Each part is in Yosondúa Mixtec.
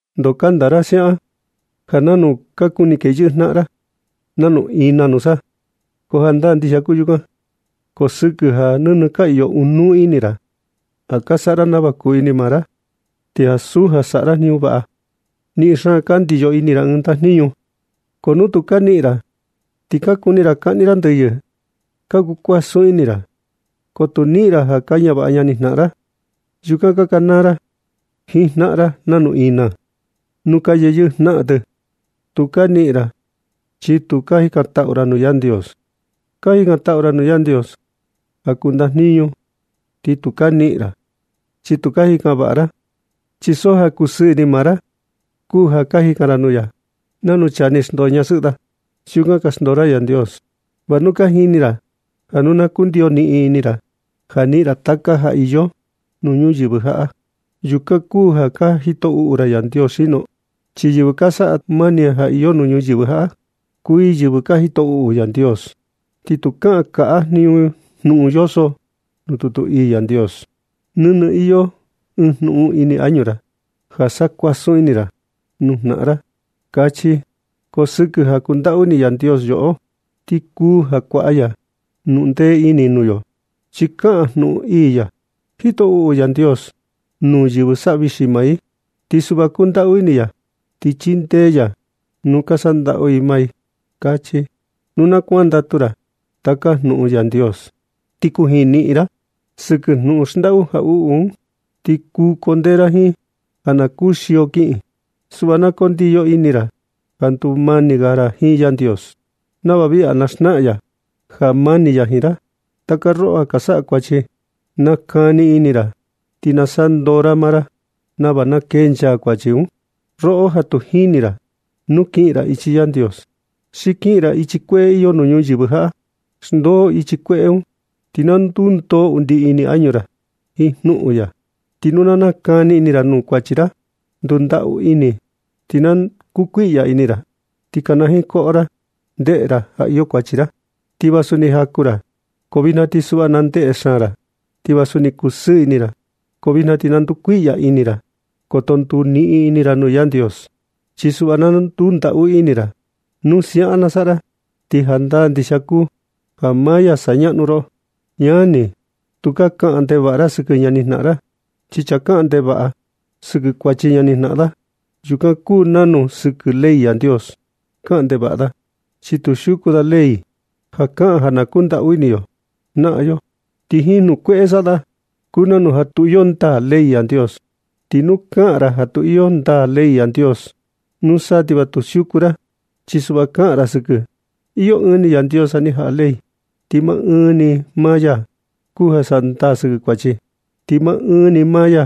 ¿Ndo kanda ra siaꞌan ja nanu ka kuni keyɨꞌɨ jnaꞌan ra nanu ina nusa? Ko jandaa ndixia kuu yukan, ko sɨkɨ ja nɨnɨ ka iyo ɨɨn jnuꞌun ini ra ja saꞌa ra nava kuni maa ra, ti ansu ja saꞌa ra ɨɨn jniñu vaꞌa. Niꞌin xaan ka ndiyo ini ra ɨɨn ndajniñu, ko nu tu ka niꞌin ra, ti ka kuni ra kaꞌni ra ndɨyɨ. Ka kuu kuasun ini ra, ko tu niꞌin ra ja ka ñavaꞌa ñani jnaꞌan ra. Yukan ka kanaa ra jiin jnaꞌan ra nanu ina nuu ka yeyɨꞌɨ jnaꞌan tɨ. Tu ka niꞌin ra chi tu ka jikantaꞌu ra nuu Yandios. Ka jikantaꞌu ra nuu Yandios ja kuu ndajniñu, ti tu ka niꞌin ra, chi tu ka jikan vaꞌa ra, chi so ja kusɨɨ ini maa ra kuu ja ka jikan ra nuu ya. Nanu chaa ni xndoo ñasɨꞌɨ da, siukan ka xndoo ra Yandios. ¿Va nu ka jini ra ja nu na kundiyo niꞌin ini ra ja niꞌin ra taka ja iyo nuu ñuyɨvɨ jaꞌa, yukan kuu ja ka jito uꞌu ra Yandios xino? Chi yɨvɨ saꞌa mani jiin taka ja iyo ñuyɨvɨ jaꞌa, kuu i yɨvɨ ka jito uꞌu Yandios. Ti tu kaꞌan kaꞌa jnuꞌun yoso nuu tutu ii Yandios: “Nɨnɨ iyo jnuꞌun ini añu ra ja sa kuasun ini ra nuu jnaꞌan ra”, kachi. Ko sɨkɨ ja kundaꞌu ini Yandios yoꞌo, ti kuu ja kuaꞌa ya jnuꞌun ndee ini nuu yo. Chi kaꞌan jnuꞌun ii ya: “Jito uꞌu Yandios nuu yɨvɨ saꞌa vixi maa, ti suꞌva kundaꞌu ini ya ti chindee ya nuu yɨvɨ ka saꞌa ndaꞌu i maa i”, kachi. Nu na kuandatu ra taka jnuꞌun Yandios, ti kujiin niꞌin ra sɨkɨ jnuꞌun xndaꞌu jaꞌuꞌu un, ti kuu kundee ra jiin ja na kuxio kiꞌin. Suꞌva na kundiyo ini ra ja ndumani ga ra jiin Yandios, nava viꞌi ga na xnaꞌan ya ja mani ya jiin ra. Taka roꞌo ja ka saꞌa kuachi, na nakani ini ra ti na saꞌa ndoo ra maa ra nava na kencha kuachi un. Roꞌo ja tu jini ra nu kiꞌin ra ichi Yandios xi kiꞌin ra ichi kueꞌe iyo nuu ñuyɨvɨ jaꞌa, xndoo ichi kueꞌe un, ti na ndundoo undi ini añu ra jiin jnuꞌun ya. Ti nu na nakani ini ra nuu kuachi ra, ndundaꞌu ini, ti na koo kuiꞌya ini ra, ti kanajiin koꞌo ra, ndeꞌe ra ja iyo kuachi ra. Ti vasu ni jaku ra, ko vijna ti suꞌva na ndeꞌe xaan ra. Ti vasu ni kusɨɨ ini ra, ko vijna ti na ndukuiꞌya ini ra. Koto nduniꞌin ini ra nuu Yandios, chi suꞌva na ndundaꞌu ini ra. Nu siaꞌan na saꞌa ra, ti jandaa ndixia kuu ja maa ya na sañaꞌnu roꞌo. Ñani, tukaa ga kaꞌan ndevaꞌa ra sɨkɨ ñani jnaꞌan ra. Chi chaa kaꞌan ndevaꞌa sɨkɨ kuachi ñani jnaꞌan da, yukan kuu nanu ja sɨkɨ ley Yandios kaꞌan ndevaꞌa da. Chi tu siuku da ley ja kaꞌan ja na kundaꞌu ini yo jnaꞌan yo, ti jiin jnuꞌun kueꞌe saꞌa da un kuu nanu ja tu iyo ndaa ley Yandios. Ti nu kaꞌan ra ja tu iyo ndaa ley Yandios, nusa ti va tu siuku ra, chi suꞌva kaꞌan ra sɨkɨ. Iyo ɨɨn ni Yandios ja ni jaꞌa ley, ti maa ɨɨn ni maa ya kuu ja saꞌa ndaa sɨkɨ kuachi. Ti maa ɨɨn ni maa ya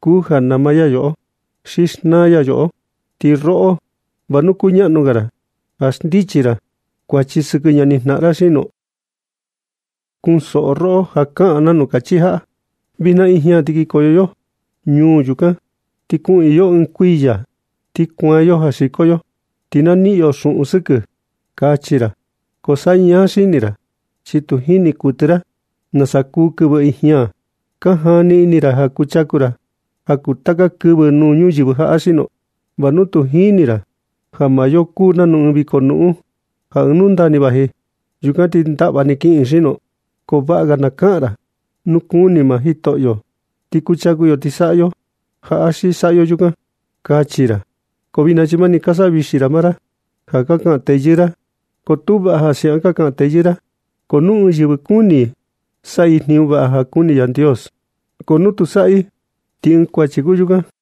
kuu ja nama yoꞌo xi xnaa ya yoꞌo. Ti roꞌo, ¿va nu kuñaꞌnu ga ra ja xndichi ra kuachi sɨkɨ ñani jnaꞌan ra xino? Chunsoꞌo roꞌo ja kaꞌan nanu kachi jaꞌa: “Vijna ijña ti kinkoyo yo ñuu yukan, ti kuꞌiin yo ɨɨn kuiya, ti kuaan yo ja xiko yo, ti na niꞌin yo xuꞌun sɨkɨ”, kachi ra. Ko sañaa xini ra, chi tu jini kuɨtɨ ra nasa kuu kɨvɨ ijña. ¿Ka jani ini ra ja kuchaku ra ja kuu taka kɨvɨ nuu ñuyɨvɨ jaꞌa xino? ¿Va nu tu jini ra ja maa yo kuu nanu ɨɨn viko nuꞌun ja ɨɨn nundaa ni vaji, yukan ti ndaꞌva ni kiꞌin xino? Ko vaꞌa ga na kaꞌan ra: “Nu kuni maa Jitoꞌo ti kuchaku yo ti saꞌa yo jaꞌa xi saꞌa yo yukan”, kachi ra. Ko vijna, chi mani ka savixi ra maa ra ja ka kaꞌan teyɨɨ ra. Ko tu vaꞌa ja siaꞌan ka kaꞌan teyɨɨ ra. Ti nu ɨɨn yɨvɨ kuni i saꞌa i jniñu vaꞌa ja kuni Yandios, ko nu tu saꞌa i, ti ɨɨn kuachi kuu yukan.